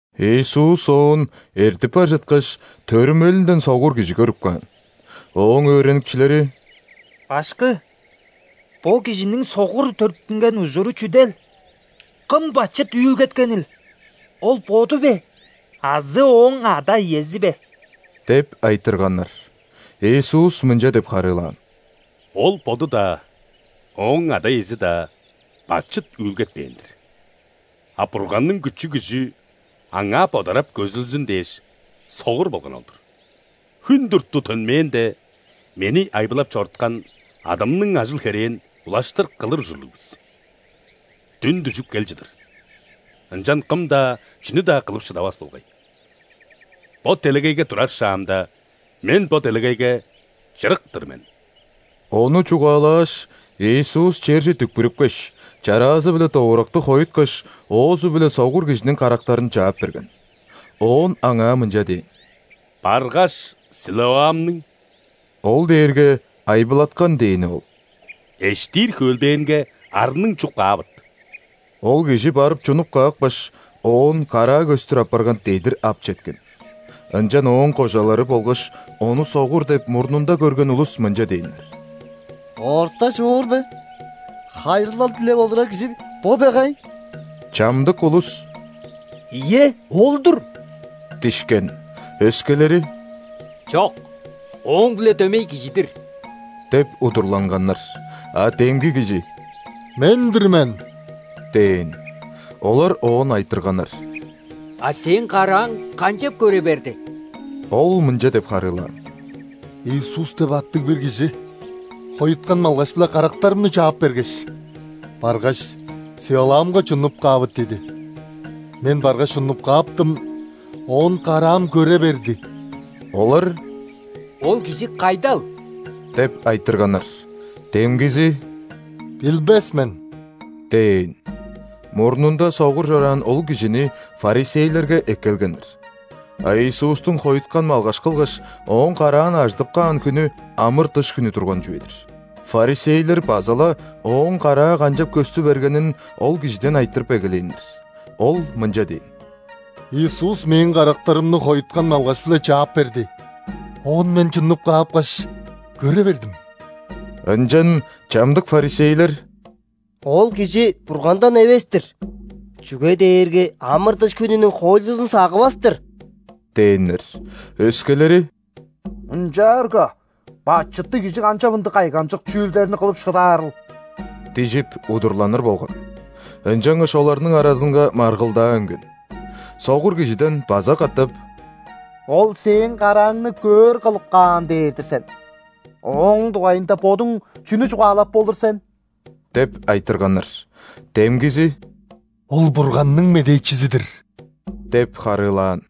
Иисус оон, эртип бар чыткаш, төрүмелинден согур кижи көрүп каан. Ооң өөреникчилери: «Башкы! Бо кижиниң согур төрүттүнген ужуру чүдел, кым бачыт үүлгеткенил: ол боду бе азы ооң ада-иези бе?» – деп айтырганнар. Иисус мынча деп харыылаан: «Ол боду-даа, ооң ада-иези-даа бачыт үүлгетпээн-дир, а Бурганның күчү-күжү аңаа бодарап көзүлзүн дээш, согур болганы ол-дур. Хүн дурту төнмээнде, Мени айбылап чоруткан Адамның ажыл-херээн улаштыр кылыр ужурлуг бис. Дүн дүжүп кел чыдыр, ынчан кым-даа чүнү-даа кылып шыдавас болгай. Бо делегейге турар шаамда, Мен – бо делегейге чырык-тыр мен». Ону чугаалааш, Иисус черже дүкпүрүпкеш, чараазы-биле довуракты хоюткаш, оозу-биле согур кижиниң карактарын чаап берген. Оон аңаа мынча дээн: «Баргаш, Силоамның (ол дээрге „Айбылаткан“ дээни ол) эштир хөөлбээнге арның чуп каавыт». Ол кижи барып чунуп каапкаш, оон караа көстүр апарган дедир ап четкен. Ынчан ооң кожалары болгаш ону согур деп мурнунда көрген улус мынча дээннер: «Орта чоор бе? Хайырлал дилеп олурар кижи бо бе, кай?» Чамдык улус: «Ийе, ол-дур» – дишкен. Өскелери: «Чок, ооң-биле дөмей кижи-дир» – деп удурланганнар. А демги кижи: «Мен-дир мен» – дээн. Олар оон айтырганнар: «А сээң карааң канчап көре берди?» Ол мынча деп харыылаан: «Иисус деп аттыг бир кижи хоюткан малгаш-биле карактарымны чаап бергеш: „Баргаш, Силоамга чунуп каавыт“ – диди. Мен баргаш, чунуп кааптым, оон караам көре берди». Олар: «Ол кижи кайдал?» – деп айтырганнар. Демгизи: «Билбес мен» – дээн. Мурнунда согур чораан ол кижини ·фарисейлерге эккелгеннер. А Иисустуң хоюткан малгаш кылгаш, ооң караан ажыдып каан хүнү ·амыр-дыш хүнү турган чүве-дир. Фарисейлер база-ла ооң караа канчап көстү бергенин ол кижиден айтырып эгелээннер. Ол мынча дээн: «Иисус мээң карактарымны хоюткан малгаш-биле чаап берди. Оон мен чунуп каапкаш, көре бердим». Ынчан чамдык ·фарисейлер: «Ол кижи Бургандан эвес-тир, чүге дээрге амыр-дыш хүнүнүң хоойлузун сагывас-тыр» – дээннер. Өскелери: «Ынчаарга бачыттыг кижи канчап ындыг кайгамчык чүүлдерни кылып шыдаарыл?» – дижип, удурланыр болган. Ынчангаш оларның аразынга маргылдаа үнген. Согур кижиден база катап: «Ол сээң карааңны көөр кылып каан дээр-дир сен. Ооң дугайында бодуң чүнү чугаалап болур сен?» – деп айтырганнар. Демгизи: «Ол – Бурганның медээчизи-дир» – деп харыылаан.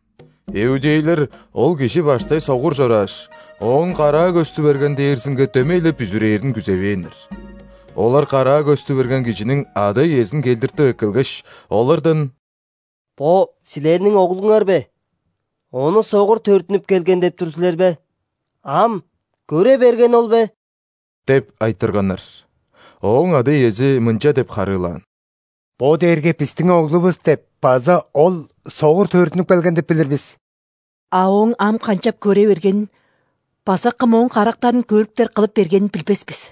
Иудейлер ол кижи баштай согур чорааш, оон караа көстү берген дээрзинге дөмей-ле бүзүрээрин күзевээннер. Олар караа көстү берген кижиниң ада-иезин келдиртип эккелгеш, олардан: «Бо силерниң оглуңар бе? Ону согур төрүттүнүп келген деп тур силер бе? Ам көре бергени ол бе?» – деп айтырганнар. Ооң ада-иези мынча деп харыылаан: «Бо дээрге бистиң оглувус деп база ол согур төрүттүнүп келген деп билир бис. А ооң ам канчап көре бергенин база кым ооң карактарын көрүптер кылып бергенин билбес бис.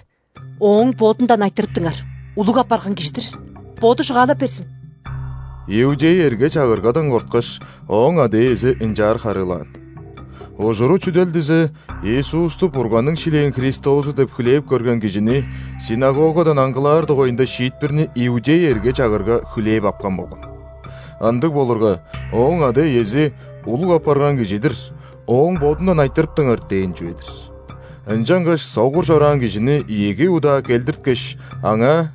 Ооң бодундан айтырыптыңар, улуг апарган кижи-дир, боду чугаалап берзин». (Иудей эрге-чагыргадан корткаш, ооң ада-иези ынчаар харыылаан. Ужуру чүдел дизе, Иисусту Бурганның шилээн Христозу деп хүлээп көрген кижини ·синагогадан аңгылаар дугайында шиитпирни иудей эрге-чагырга хүлээп апкан болган. Ындыг болурга, ооң ада-иези: «Улуг апарган кижи-дир, ооң бодундан айтырыптыңар» – дээн чүве-дир.) Ынчангаш согур чораан кижини ийиги удаа келдирткеш, аңаа: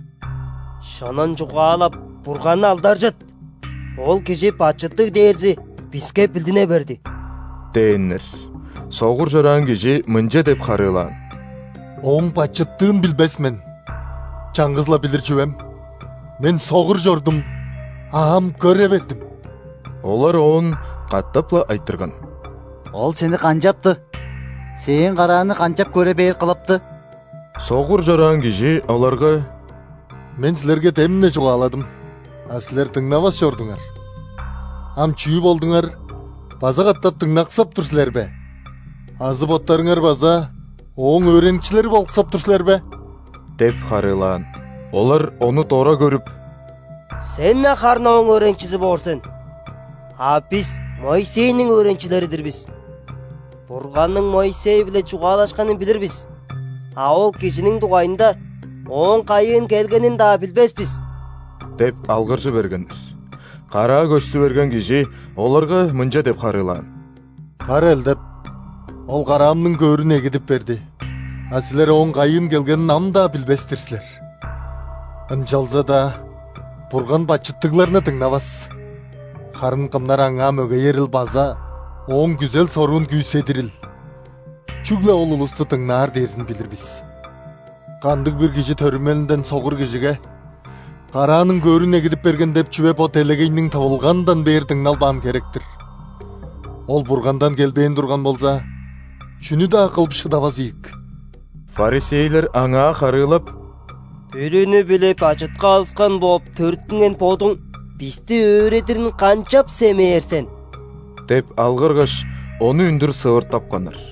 «Шынын чугаалап, Бурганны алдаржыт! Ол кижи бачыттыг дээрзи биске билдине берди» – дээннер. Согур чораан кижи мынча деп харыылаан: «Ооң бачыттыын билбес мен, чаңгыс-ла билир чүвем: мен согур чордум, а ам көре бердим». Олар оон катап-ла айтырган: «Ол сени канчапты? Сээң карааңны канчап көре бээр кылыпты?» Согур чораан кижи оларга: «Мен силерге дем-не чугааладым, а силер дыңнавас чордуңар. Ам чүү болдуңар, база катап дыңнаксап тур силер бе? Азы боттарыңар база Ооң өөреникчилери болуксап тур силер бе?» – деп харыылаан. Олар ону дора көрүп: «Сен-не харын Ооң өөреникчизи боор сен! А бис Моисейниң өөреникчилери-дир бис! Бурганның Моисей-биле чугаалашканын билир бис, а ол Кижиниң дугайында, Ооң кайыын келгенин-даа билбес бис» – деп алгыржы бергеннер. Караа көстү берген кижи оларга мынча деп харыылаан: «Кара элдеп! Ол караамның көөрүн эгидип берди, а силер Ооң кайыын келгенин ам-даа билбес-тир силер. Ынчалза-даа Бурган бачыттыгларны дыңнавас, харын кымнар Аңаа мөгеерил база Ооң күзел-соруун күүседирил, чүгле ол улусту дыңнаар дээрзин билир бис. Кандыг-бир кижи төрүмелинден согур кижиге карааның көөрүн эгидип берген деп чүве бо делегейниң тывылганындан бээр дыңналбаан херек-тир. Ол Бургандан келбээн турган болза, чүнү-даа кылып шыдавас ийик!» Фарисейлер аңаа харыылап: «Бүрүнү-биле бачытка алыскан бооп төрүттүнген бодуң, бисти өөредирин канчап семээр сен?!» – деп алгыргаш, ону үндүр сывыртапканнар.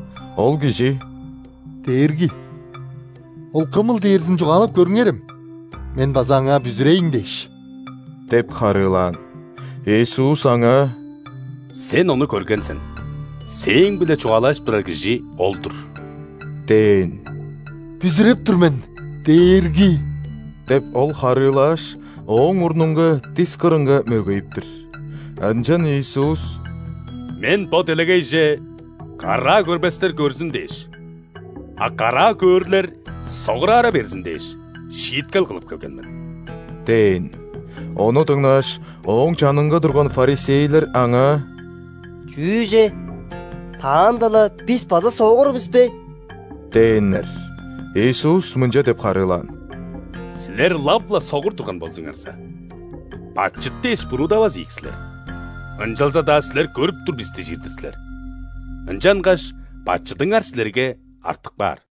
Ол кижи: «Дээрги, Ол кымыл дээрзин чугаалап көрүңерем, мен база Аңаа бүзүрээйн дээш» – деп харыылаан. Иисус аңаа: «Сен Ону көрген сен. Сээң-биле чугаалажып турар кижи Ол-дур» – дээн. «Бүзүреп тур мен, Дээрги!» – деп, ол харыылааш, Ооң мурнунга дис кырынга мөгейип-тир. Ынчан Иисус: «Мен бо делегейже караа көрбестер көрзүн дээш, а караа көөрлер согурара берзин дээш, шииткел кылып келген мен» – дээн. Ону дыңнааш, Ооң чанынга турган ·фарисейлер Аңаа: «Чүүже? Таанда-ла бис база согур бис бе?» – дээннер. Иисус мынча деп харыылаан: «Силер ылап-ла согур турган болзуңарза, бачыт дээш буруудавас ийик силер. Ынчалза-даа силер көрүп тур бис дижир-дир силер, ынчангаш бачыдыңар силерге артып каар».